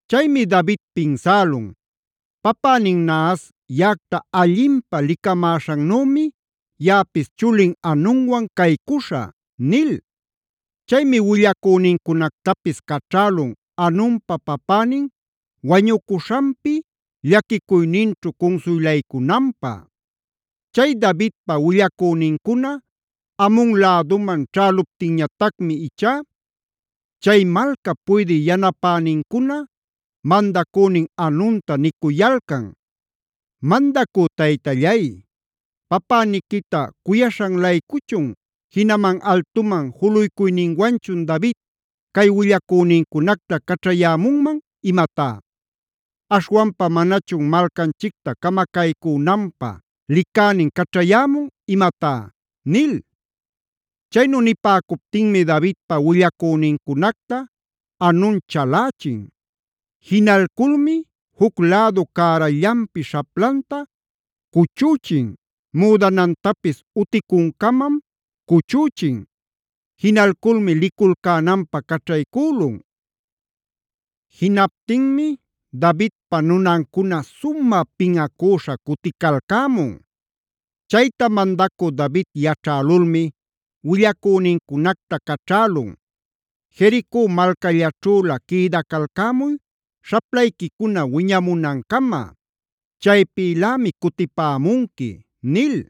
Chaymi David pinsälun: “Papänin Nahas yaꞌacta allinpä licamäśhannümi yaꞌapis chulin Hanunwan caycuśhä” nil. Chaymi willacünincunactapis caćhälun Hanunpa papänin wañucuśhanpi llaquicuyninćhu cunsuylaycunanpä. Chay Davidpa willacünincuna Amon läduman ćhäluptinñatacmi ichá, chay malcap puydï yanapänincuna mandacünin Hanunta nicuyalcan: “Mandacü taytallay, ¿papäniquita cuyaśhan-laycuchun, jinaman altuman juluycuyninwanchun David cay willacünincunacta caćhayämunman imatá? ¿Aśhwanpa manachun malcanchicta camacaycünanpä licänin caćhayämun imamá?” nil. Chaynu nipäcuptinmi Davidpa willacünincunacta Hanun chalächin. Jinalculmi juc lädu cärallanpi śhaplanta cuchüchin; müdanantapis uticuncamam cuchüchin. Jinalculmi liculcänanpä caćhaycülun. Jinaptinmi Davidpa nunancuna sumä pinꞌacüśha cuticalcämun. Chayta mandacü David yaćhälulmi willacünincunacta caćhälun: “Jerico malcällaćhülä quïdacalcämuy śhaplayquicuna wiñamunancama; chaypïlämi cutipämunqui” nil.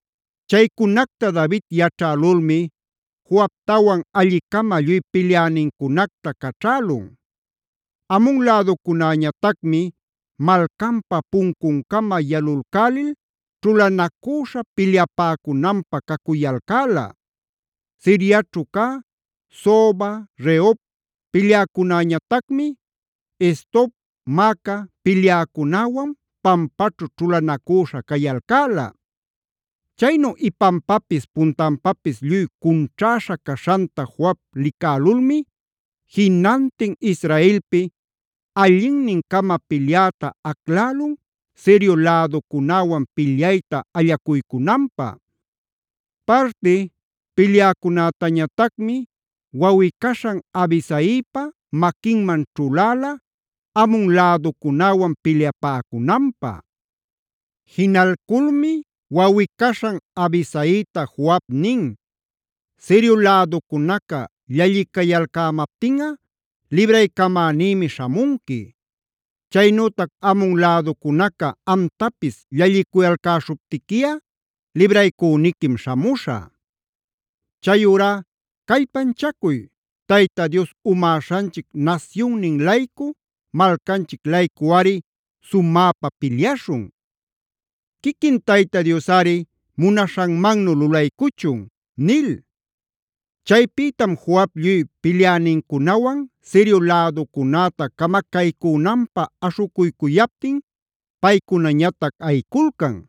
Chaycunacta David yaćhälulmi Joabtawan alli-cama lluy pilyänincunacta caćhälun. Amon läducunäñatacmi malcanpa puncuncama yalulcälil ćhulanacüśha pilyapäcunanpä cacuyalcäla. Siriaćhu cä, Soba, Rehob pilyäcunäñatacmi, Is-tob, Maaca pilyäcunäwan pampaćhu ćhulanacüśha cayalcäla. Chaynu ipanpapis puntanpapis lluy cunćhäśha caśhanta Joab licälulmi jinantin Israelpi allinnin-cama pilyäta aclälun Sirio läducunäwan pilyayta allacuycunanpä. Parti pilyäcunätañatacmi wawꞌi-caśhan Abisaipa maquinman ćhuläla Amon läducunäwan pilyapäcunanpä. Jinalculmi wawꞌi-caśhan Abisaita Joab nin: “Sirio läducunaca llallicayalcämaptinꞌa libraycamänïmi śhamunqui; chaynütac Amon läducunaca amtapis llallicuyalcäśhuptiquiꞌa libraycüniquim śhamuśhä. Chayurá ¡callpanchacuy! ¡Tayta Dios umäśhanchic nasyunnin-laycu, malcanchic-laycuꞌari sumäpa pilyaśhun! Quiquin Tayta Diosꞌari munaśhanmannu lulaycuchun” nil. Chaypïtam Joab lluy pilyänincunawan Sirio läducunäta camacaycünanpä aśhucuycuyaptin paycunañatac ayiculcan.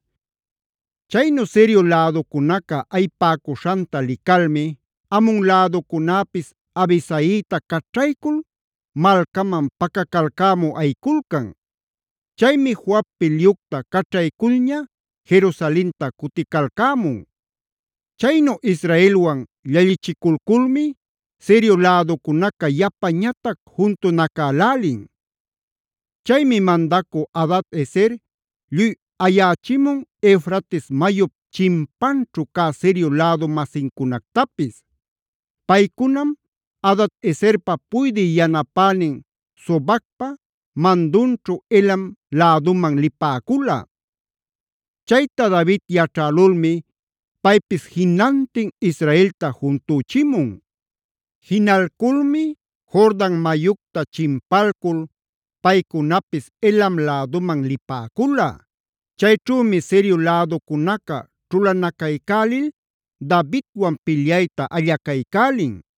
Chaynu Sirio läducunaca ayipäcuśhanta licalmi Amon läducunäpis Abisaita caćhaycul malcaman pacacalcämü ayiculcan. Chaymi Joab pilyucta caćhayculña Jerusalenta cuticalcämun. Chaynu Israelwan llallichiculculmi Sirio läducunaca yapañatac juntunacälälin. Chaymi mandacü Hadad-ezer lluy ayächimun Eufrates mayup chimpanćhu cä Sirio lädu-masincunactapis. Paycunam Hadad-ezerpa puydï yanapänin Sobacpa mandunćhu Helam läduman lipäcula. Chayta David yaćhälulmi paypis jinantin Israelta juntüchimun. Jinalculmi Jordan mayucta chimpalcul paycunapis Helam läduman lipäcula. Chayćhümi Sirio läducunaca ćhulanacaycälil Davidwan pilyayta allacaycälin.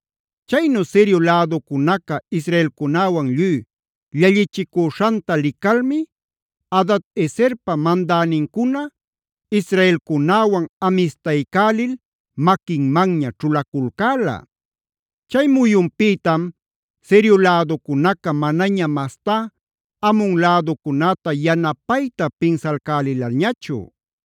Chaynu Sirio läducunaca israelcunäwan lluy llallichicüśhanta licalmi Hadad-ezerpa mandänincuna israelcunäwan amistaycälil maquinmanña ćhulaculcäla. Chay muyunpïtam Sirio läducunaca manaña mastá Amon läducunäta yanapayta pinsalcälilañachu.